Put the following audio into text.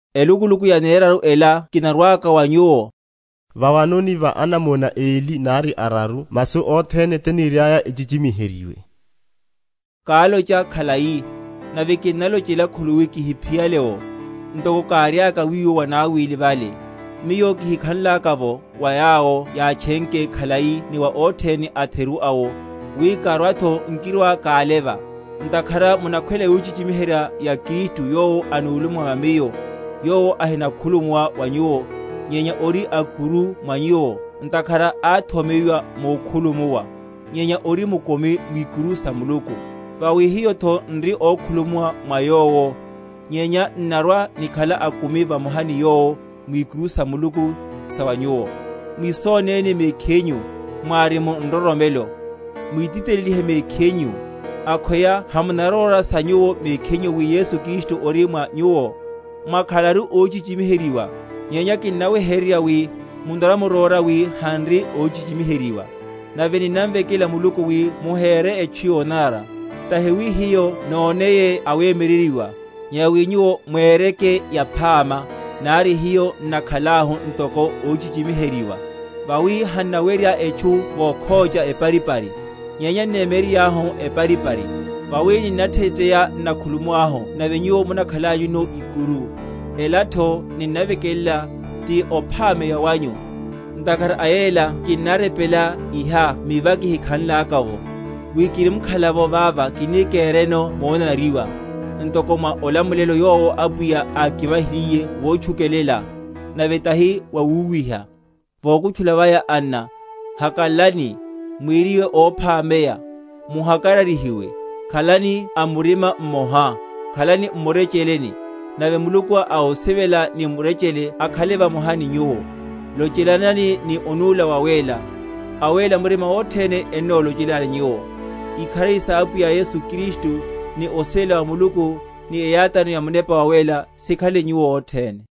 Elukuluku yaneraru ela kinarwaka wa nyuwo. Vawanoni va anamona eli nari araru masu othene tiniriaya echichimiheryiwe. Kálocha khalai, nave kinnalochela khuluwi kihiphiyale’wo, ntoko káriaka wiwo vanawili vale, miyo kihikhanlaka’vo, wa yawo yátchenke khalai ni wa othene atheru awo, wi, karwatho nkirwa‐káleva; ntakhara munakhwela yochichimiherya ya Kristu yowo anuluma mwa miyo; yowo ahinakhulumuwa wa nyuwo, nyenya ori a’kuru mwa nyuwo; ntakhara áthomeyiwa mukhulumuwa, nyenya ori mukumi mwikuru sa Muluku. Vawi hiyotho n’ri ókhulumuwa mwa Yowo, nyenya n’narwa‐nikhala akumi vamoha ni Yowo, mwikuru sa Muluku, sa wa nyuwo. Mwisónéni mekhinyu, mwári mu nroromelo, mwititelelihe mekhinyu. Akhweya hamunaróra sa nyuwo mekhinyu wi Yesu Kristu ori mwa nyuwo? mwakhalaru óhichichimiheryiwa. Nyenya kinnaweheryerya wi munarwa‐muróra wi han’ri óhichichimiheryiwa. Nave ninnamvekela Muluku wi muhere etchu yonanara; tahi wi hiyo noneye awemyeryeryiwa, nyenya wi nyuwo mwereke yaphama, nari hiyo n’nakhalahu ntoko óhichichimiheryiwa. Vawi hannawerya etchu vokhócha eparipari, nyenya n’nemyeryeryahu eparipari. Vawi ninnatheya, n’nakhulumuwahu nave nyuwo mukhanlanyuno ikuru; elatho ninnavekelela, ti ophameya wanyu. Ntakhara a yela kinnarepela iha mi va kihikhanlaka’vo, wi kirimkhala vava kini kereno monanariwa, ntoko mwa olamulelo yowo Apwiya ákivahiliye wotchukelela, nave tahi wawúwiha. Vokutchula vaya, anna, hakalalani. Mweriwe óphameya; muhakararyihiwe; khalani a murima mmoha, khalani m’murecheleni; nave Muluku a osivela ni murechele akhale vamoha ni nyuwo. Lochelanani ni onúla wawéla. Awéla murima othene ennolochelani nyuwo. Ikharari sa Apwiya Yesu Kristu, ni osivela wa Muluku, ni eyátáno ya Munepa Wawéla sikhale ni nyuwo othene.